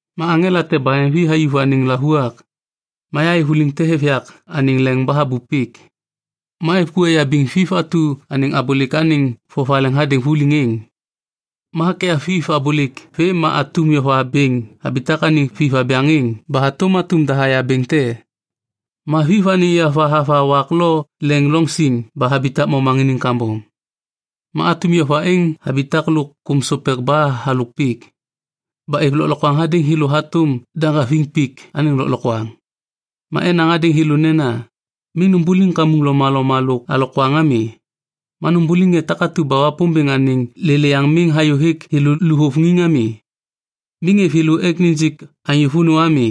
Ma aŋela te baheŋvi hayuv anêŋ lavuak. Ma yahayê vuliŋ te hêv yak anêŋ leŋ ba habup pik. Ma êv ku neyabiŋ Viv atu anêŋ abôlêk anêŋ vovaleŋ hadêŋ vuliŋ êŋ. Ma hakyav Viv abôlêk vê ma atum yova bêŋ habitak anêŋ Viv abyaŋ êŋ ba hatôm atum dahaya bêŋ te. Ma Viv anêŋ yova hava wak lo leŋ loŋ siŋ ba habitak momaŋiniŋ kambom. Ma atum yova êŋ habitak lôk kôm sopek ba halôk pik. Ba êv lôklokwaŋ hadêŋ thêlô hatôm daŋgaviŋ pik anêŋ lôklokwaŋ. Ma enaŋ hadêŋ thêlô nena, “Miŋ numbuliŋ kamuŋ lomaloma lo alokwaŋ ami. Ma numbuliŋ ŋê takatu ba Wapômbêŋ anêŋ lêlêyaŋ miŋ hayôhêk thêlô luvôŋiŋ ami.” Miŋ êv thêlô ek nijik anyô vônô ami,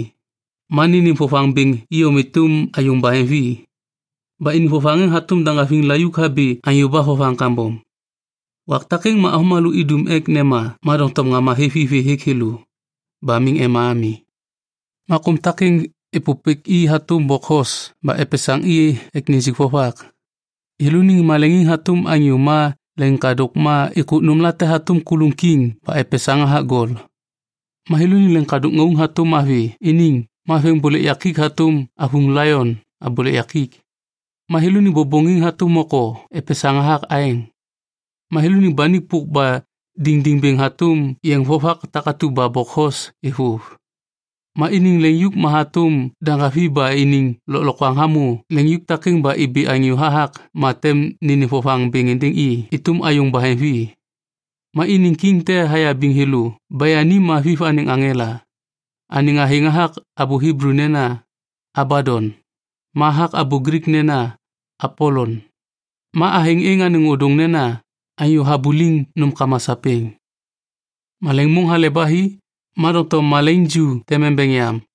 ma nênêm vovaŋ bêŋ iyom êtôm ayôŋ baheŋvi. Ba iniŋ vovaŋ êŋ hatôm daŋgaviŋ layuk habi anyô ba vovaŋ kambom. Wak takêŋ ma avômalô idum ek nema ma doŋtom ŋama hêv i vê hêk thêlô. Ba miŋ ema ami. Ma kôm takêŋ êpôpêk i hatôm bokhos ba epesaŋ i ek nijik vovak. Thêlôniŋ maleŋiŋ hatôm anyô ma leŋiŋkadôk ma êkôk nômlate hatôm kuluŋ kiŋ ba epesaŋ hathak gol. Ma thêlôniŋ leŋiŋkadôk ŋauŋ hatôm avi iniŋ ma veŋiŋbôlêk yakik hatôm avuŋ laion abôlêk yakik. Ma thêlôniŋ bôbôŋiŋ hatôm moko epesaŋ hathak aeŋ. Ma thêlôniŋ banik pôk ba diŋdiŋ bêŋ hatôm yeŋ vovak takatu ba bokhos êvôv. Ma iniŋ leŋyuk ma hatôm daŋgaviŋ ba iniŋ lôklokwaŋ hamô leŋyuk takêŋ ba ibi anyô hathak ma tem nênêm vovaŋ bêŋ êndêŋ i êtôm ayôŋ baheŋvi. Ma iniŋ kiŋ te hayabiŋ thêlô ba yani ma Viv anêŋ aŋela. Anêŋ athêŋ hathak abô Hiblu nena, “Abadon” ma hathak abô Glik nena, “Apolon”. Ma athêŋ êŋ anêŋ ôdôŋ nena “Anyô Habuliŋ Nômkama Sapêŋ”. Malaiŋ môŋ hale ba hi, ma doŋtom malaiŋ ju tem embeŋ yam.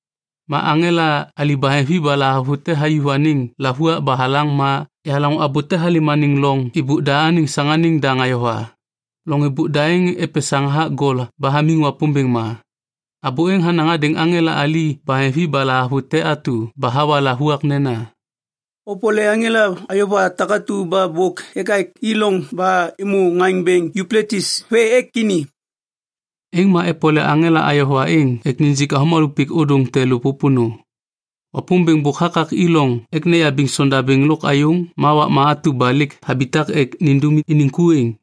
Ma aŋela ali baheŋvi ba lahavute hayuv anêŋ lavuak ba halaŋ ma yahalaŋô abô te halêm anêŋ loŋ êbôk da anêŋ saŋanêŋ daŋ ayova. Loŋ êbôk da êŋ epesaŋ hathak gol ba hamiŋ Wapômbêŋ ma. Abô êŋ hanaŋ hadêŋ aŋela ali baheŋvi ba lahavute atu ba hawa lavuak nena, “Opole aŋela ayova takatu ba bôk ekak i loŋ ba êmô ŋaŋ bêŋ Yupletis vê ek ini.” Êŋ ma epole aŋela ayova êŋ ek nijik avômalô pik ôdôŋ te lô pôpônô. Wapômbêŋ bôk hakak i loŋ ek neyabiŋ sondabêŋ lôk ayôŋ ma wakma atu ba lêk habitak ek nindum iniŋ ku êŋ.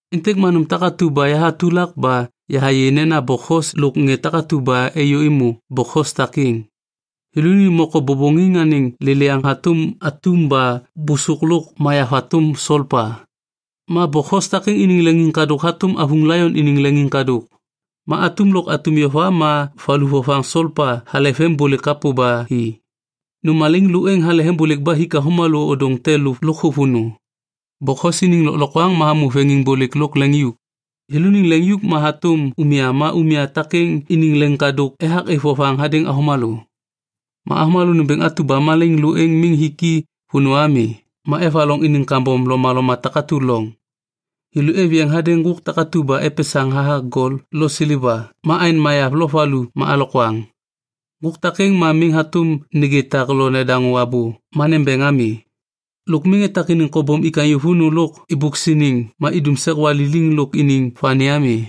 Êntêk ma nôm takatu ba yahatulak ba yahayê nena bokhos lôk ŋê takatu ba êyô êmô bokhos takêŋ. Thêlôniŋ moko bôbôŋiŋ anêŋ lêlêyaŋ hatôm atum ba bôsôk lôk mayav hatôm solpa. Ma bokhos takêŋ iniŋ leŋiŋkadôk hatôm avuŋ laion iniŋ leŋiŋkadôk. Ma atum lôk atum yova ma valu vovaŋ solpa hale veŋiŋbôlêk kapô ba hi. Nôm malaiŋ lô êŋ hale veŋiŋbôlêk ba hik avômalô ôdôŋ te lô lôkthô vônô. Bokhos iniŋ lôklokwaŋ ma hamô veŋiŋbôlêk lôk leŋyuk. Thêlôniŋ leŋyuk ma hatôm umya ma umya takêŋ iniŋ leŋiŋkadôk ethak êv vovaŋ hadêŋ avômalô. Ma avômalô nômbêŋ atu ba malaiŋ lô êŋ miŋ hik i vônô ami ma evaloŋ iniŋ kambom lomaloma takatu loŋ. Thêlô êv yeŋ hadêŋ ŋgôk takatu ba epesaŋ hathak gol lo seleva ma aeŋ mayav lôk valu ma alokwaŋ. Ŋgôk takêŋ ma miŋ hatôm nêgê tak lo nedaŋô abô ma nembeŋ ami. Lôk miŋ etak iniŋ kobom ik anyô vônô lôk êbôk siniŋ ma idum sek waliliŋ lôk iniŋ vani ami.